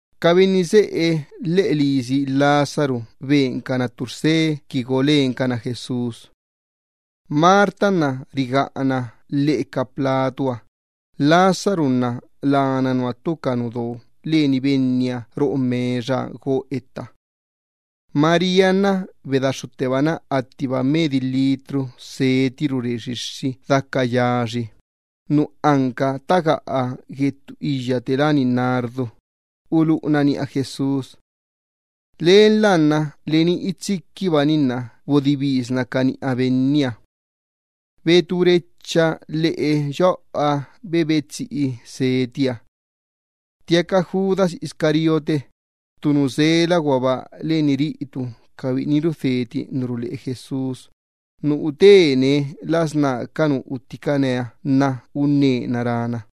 Ca benni seꞌe lheꞌe lisi Lázaro bencana ttu rse qui go lencana Jesús. Marta nna rigaꞌana lheꞌe ca platuha, Lázaro nna labi biꞌiniha ttu ca benni do lanie roꞌo mexaha go etta. María bedaxxuttebana attiba medi litro seti rure xixxi daca yaxi, nu anca ttagaꞌa gue ttu iyya te láni nardo, uluꞌuna niꞌa Jesús. Lenla nna leni itsiquibani bodibisna ca niꞌa Benniha. Betú rechaba lheꞌe yoꞌoha bebe tsiꞌi setiha. Ttiaca Judas Iscariote, ttu nu sela guaba len ca biꞌini rudheti ca tisa ruleꞌe Jesús, nu utene las ná ca nu utticane unnena rána: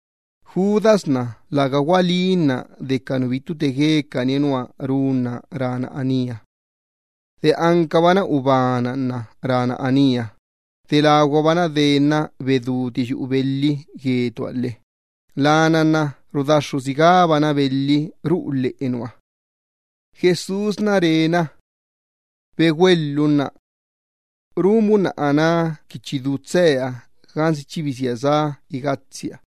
Judas nna läga gualínna de ca nu bittu te guecaniha nua runna rána anía. De ancabana ubana nuarca rána anía, de laguabana denna beduti yuꞌu belhiha lhe lana nna chiba ancabienna rudaxxu sigána belhi ruꞌu lheꞌe nua. Nianna, rá Jesús Judas: —Begüeelhunna. Run bunna aná qui chi bedú tseea gansi chi bisía sá igatsia.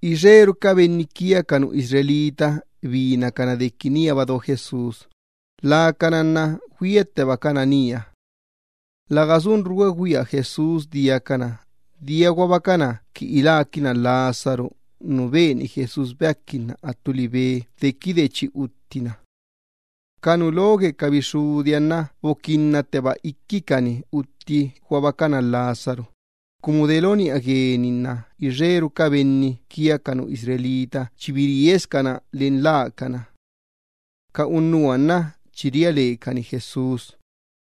Ixeru ca benni Israel binacana dequi níaba do Jesús, lacana nna güiattebacana nía. Läga sunru güegüia Jesús diacana, dia guabacana qui iláquinna Lázaro nu beni Jesús beaquinna dequide chi utttina. Ca nu lo gue ca bixxudiha nna boquinnatteba iquicani utti guabacana Lázaro, cumu de lo niꞌa gueni nna ixeru ca benni Israel chi biriescana len lacana. Ca unnuha nna chi ria lecani Jesús.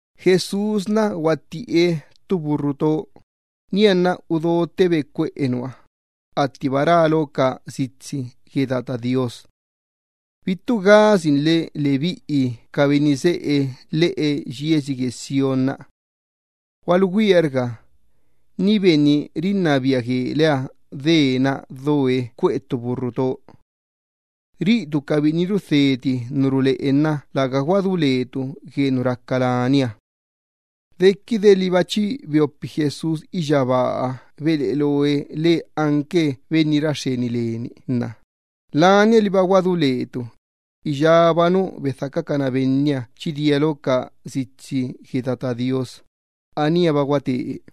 Jesús guattiꞌe ttu burru cuiti, nianna udottebe cuꞌe nua, attiba rá lo ca sitsi gue Tata Do Iyyabaaha: Bittu gasinle, lebiꞌi ca benni seꞌe lheꞌe yiesi Sión; Gualugüiarga, ni benni rinnabia gueleha dee doe cuꞌe ttu burru cuiti. Ca biꞌini rudheti ca tisa ruleꞌe nna läga guadú lecabi gue nu raca lania. Dequide liba chi beopi Jesús iyyabaaha beleꞌe loe lee anque benni ra xxeni leni, lania liba guadú lecabi iyába nu bedhacacana Benniha nna chi dia lo ca sitsi gue Tata Do Iyyabaaha, aníaba guate.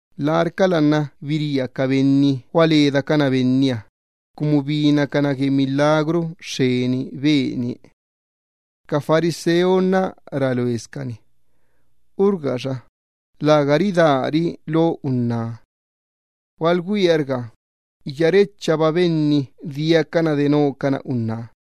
Larcala nna biría ca benni gualedacana Benniha, cumu binacana gue milagru xxeni benie. Ca fariseo nna rá loescani: —Urga xa, läga ridári lo unná. Gualugüiarga, iyárechaba ca benni diacana denocana unná.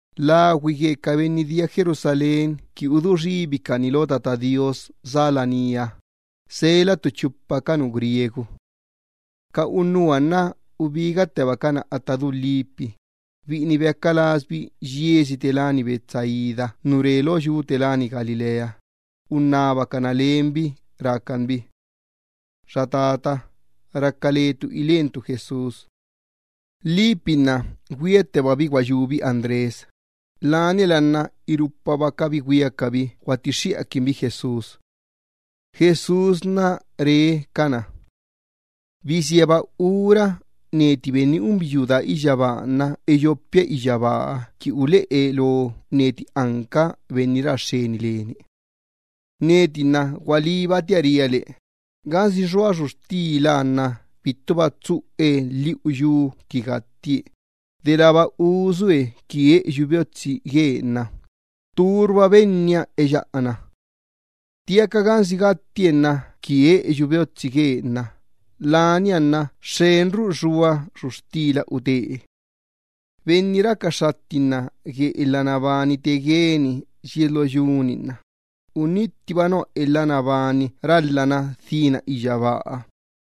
Lagüi gue ca benni dia laní lheꞌe yiesi Jerusalén qui cuequixxencana Tata Do Iyyabaaha, sela ttu chupa ca benni Grecia. Ca unnuha nna ubigattebacana atta du Felipe, biꞌini beaca lasbi yiesi Betsaida nu re lo yu gue Galilea, unnabacana lenbi rácan bi: —Xa tata, raca letu ilentu Jesús. Felipe nna güiattebabi guayúbi Andrés, laniala nna irupabacabi güiacabi guattixxiꞌaquinbi Jesús. Benniha nna re cabi: —Bisíaba ura neti Benni unbiyuu daa iyyabaaha nna eyopia iyyabaaha qui uleꞌe lo neti anca Benni ra xxeni leni. Neti nna gualíbatia ria le, gansi xua xuxtila nna bittuba tsuꞌe lhiꞌu yu qui gattie, delába usue qui eꞌeyu beotsi guee nna tturba benniha eyaꞌana. Ttiaca gansi gattie nna qui eꞌeyu beotsi guee nna lania nna xxenru xua xuxtila utee. Benni raca xxattinna gue elha nabani te gueni yies lo yu-ni nna unittibana elha nabani ralhana dhína iyyabaaha,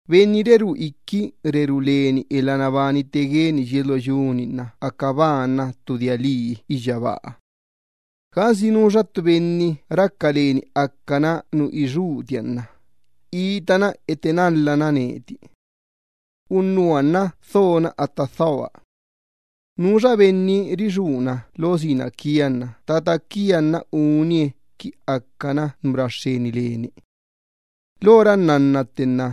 benni rerú iqui rerú leni elha nabani te gueni yies lo yu-ni nna aca banba nua ttu dia lii lo Tata do Iyyabaaha. Gansi nuxa ttu benni raca leni acana nu ixuutia unna nu raca lasia nna itana etenalhana neti. Unnuha nna dhona atta dhoa. Nuxa benni rixuuna lo sina quia nna Tata quia nna unie acana nu ra xxeni leni. ’Lora nnanna tte nna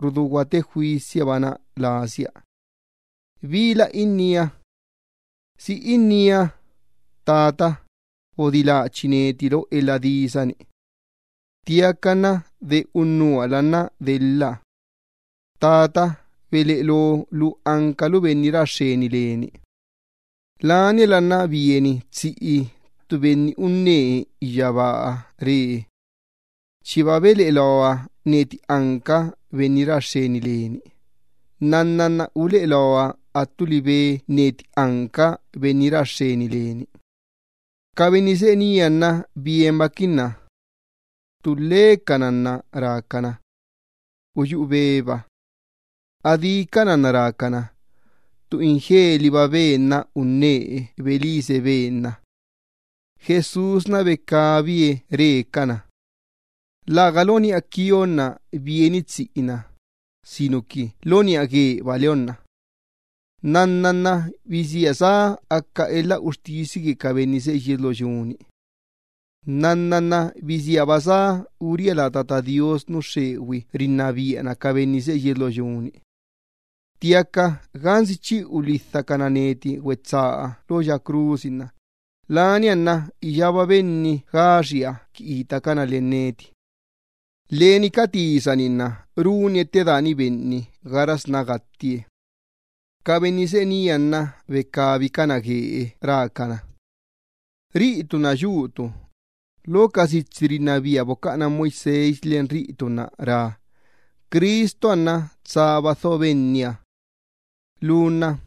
rudú guate juisiabana lasia. ¿Bila innía? ¿Si innía: “Tata, bodiláchi neti lo elha disa-ni”? Ttiaca nna de unnuhala nna delha. Tata, beleꞌe lo lu ancalu Benni ra xxeni leni. Laniala nna bieni tsiꞌi ttu Benni unnee iyyabaaha re: —Chiba beleꞌe loa neti anca Benni ra xxeni leni. Nnanna nna uleꞌe loa attu libe neti anca benni ra xxeni leni. Ca benni seꞌe nía nna bienbaquinna. Ttulhecana nna rácana: —Uyuꞌu beba. Adícana nna rácana: —Ttu ingeliba Ben-na unnee belise Ben-na. Jesús becabie re cana: —Läga lo niꞌa quionna bieni tsiꞌi-na, sinuqui lo niꞌa gueba leonna. Nnanna nna bisíaba sá aca elha uxtisi gue ca benni seꞌe yies lo yu-ni. Nnanna nna bisíaba sá uría la Tata Do Iyyabaaha nu xxegüi rinnabiana ca benni seꞌe yies lo yu-ni. Ttiaca gansi chi ulhidhacana neti güetsaa lo ya crusi nna lania nna iyába benni gaxia qui itacana len neti. Leni ca tisa-ni nna runie ttedaani benni gaxasná gattie. Ca benni seꞌe nía nna becabicana guee rácana: —Riꞌitu nna yutu, lo ca ley bocaꞌana Moisés len riꞌitu nna rá: Cristuha nna tsaba dho Benniha. Lu nna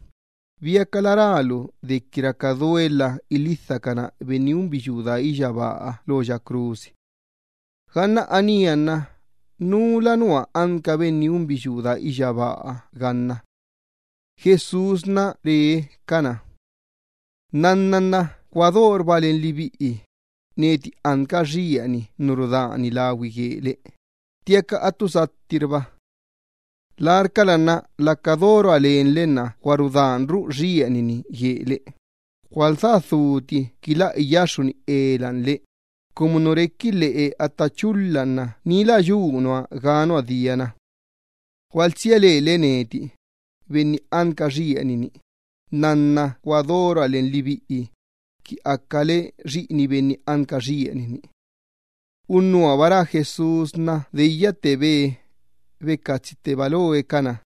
¿biacala rálu dequi raca duelha ilhidhacana Benni unbiyuu daa iyyabaaha lo ya crusi? Ganna anía nna ¿Núla nua anca Benni unbiyuu daa iyyabaaha ganna? Jesús re cana: —Nnanna nna gua dorba len lebiꞌi, neti anca xieni nu rudani lagüi guele, ttiaca attu sattirba. Larcala nna laca dorua len lebiꞌi nna gua rudanru xieni-ni guele, gualdhá dhuti qui lä iyaxxuni ela le, cumu nu requi lheꞌe atta chulha nna ni lä yu nua ga nua diana. Gualtsia lele neti, Benni anca xieni-ni, nnanna gua dorua len lebiꞌi, qui acale xiꞌini Benni anca xieni-ni. Dequide rá Jesús anía nna deyyattebe, becatsitteba loe cana.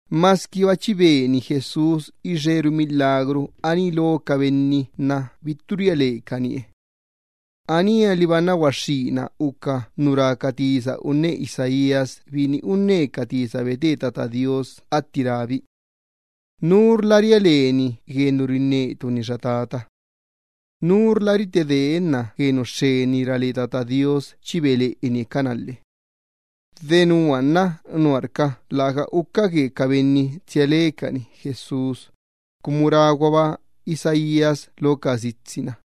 Masquiba chi beni Jesús ixeru milagru aní lo ca benni nna bittu ria lecanie. Anía liba nna guaxxína uca nu rá ca tisa unne profeta Isaías atti rábi: Nurla ria leni gue nu rinnetu-ni, xa Tata. Nurla rite deenna gue nu xxeni ra le Tata Do Iyyabaaha chi beleꞌenie cana lhe. Denua nna nuarca bittu uca tsia lecani Jesús, cumu ráguaba Isaías lo ca sitsi-na: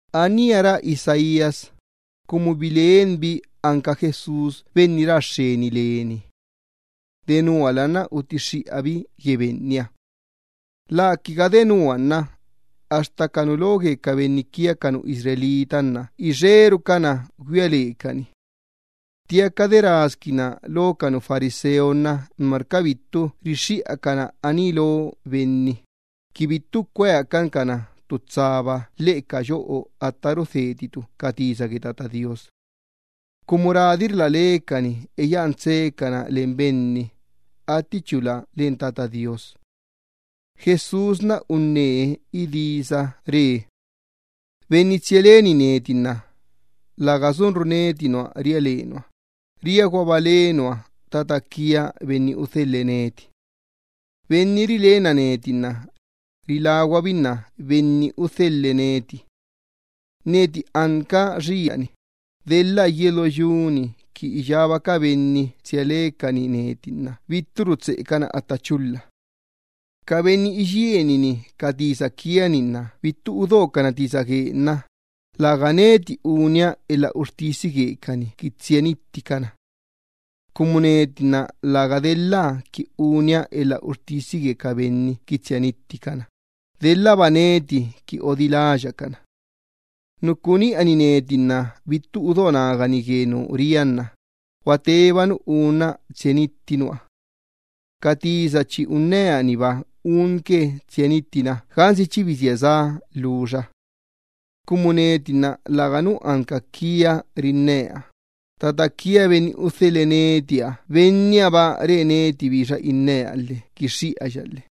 Anía rá Isaías, cumu bilenbi anca Jesús benni ra xxeni leni. Denuala nna utixxiꞌabi gue Benniha. Läquiga de nua nna axta ca nu lo gue ca benni Israel, ixerucana güia lecani. Ttiaca de rasquinna lo ca fariseo nuarca bittu rixxiꞌacana aní lo benni, qui bittu cueacan cana ttu tsaba lheꞌe ca yoꞌo atta rudheticana ca tisa gue Tata Do Iyyabaaha. Cumu radirla lecani eyaꞌan tseecana len benni, attichula len Tata Do Iyyabaaha. Jesús unnee idisa re: —Benni tsia leni neti nna läga sunru neti nua ria le nua, riaguaba le nua Tata quia Benni udhelhe neti. Benni rilenna neti nna riláguabinna Benni udhelhe neti. Neti anca xieni, delha yies lo yu-ni qui iyába ca benni tsia lecani neti nna bitturu tseꞌecana atta chulha. Ca benni iyienini ca tisa quia-ni nna bittu udocana tisa gueque nna läga neti unia elha uxtisi guecani qui tsia nitticana, cumu neti nna läga delha qui unia elha uxtisi gue ca benni qui tsia nitticana, daba neti qui odiláya cana. Nu cuꞌu niꞌani neti nna bittu udo nagani gue nu ria nna gua teba nu unna tsia nitti nua. Ca tisa chi unnea-niba unque tsia nittina gansi chi bisía sá lhuxa. Cumu neti nna läganu anca quia rinnea, Tata quia Benni udhelhe netiha Bennihaba re neti bixa innea lhe quixxiꞌaya lhe.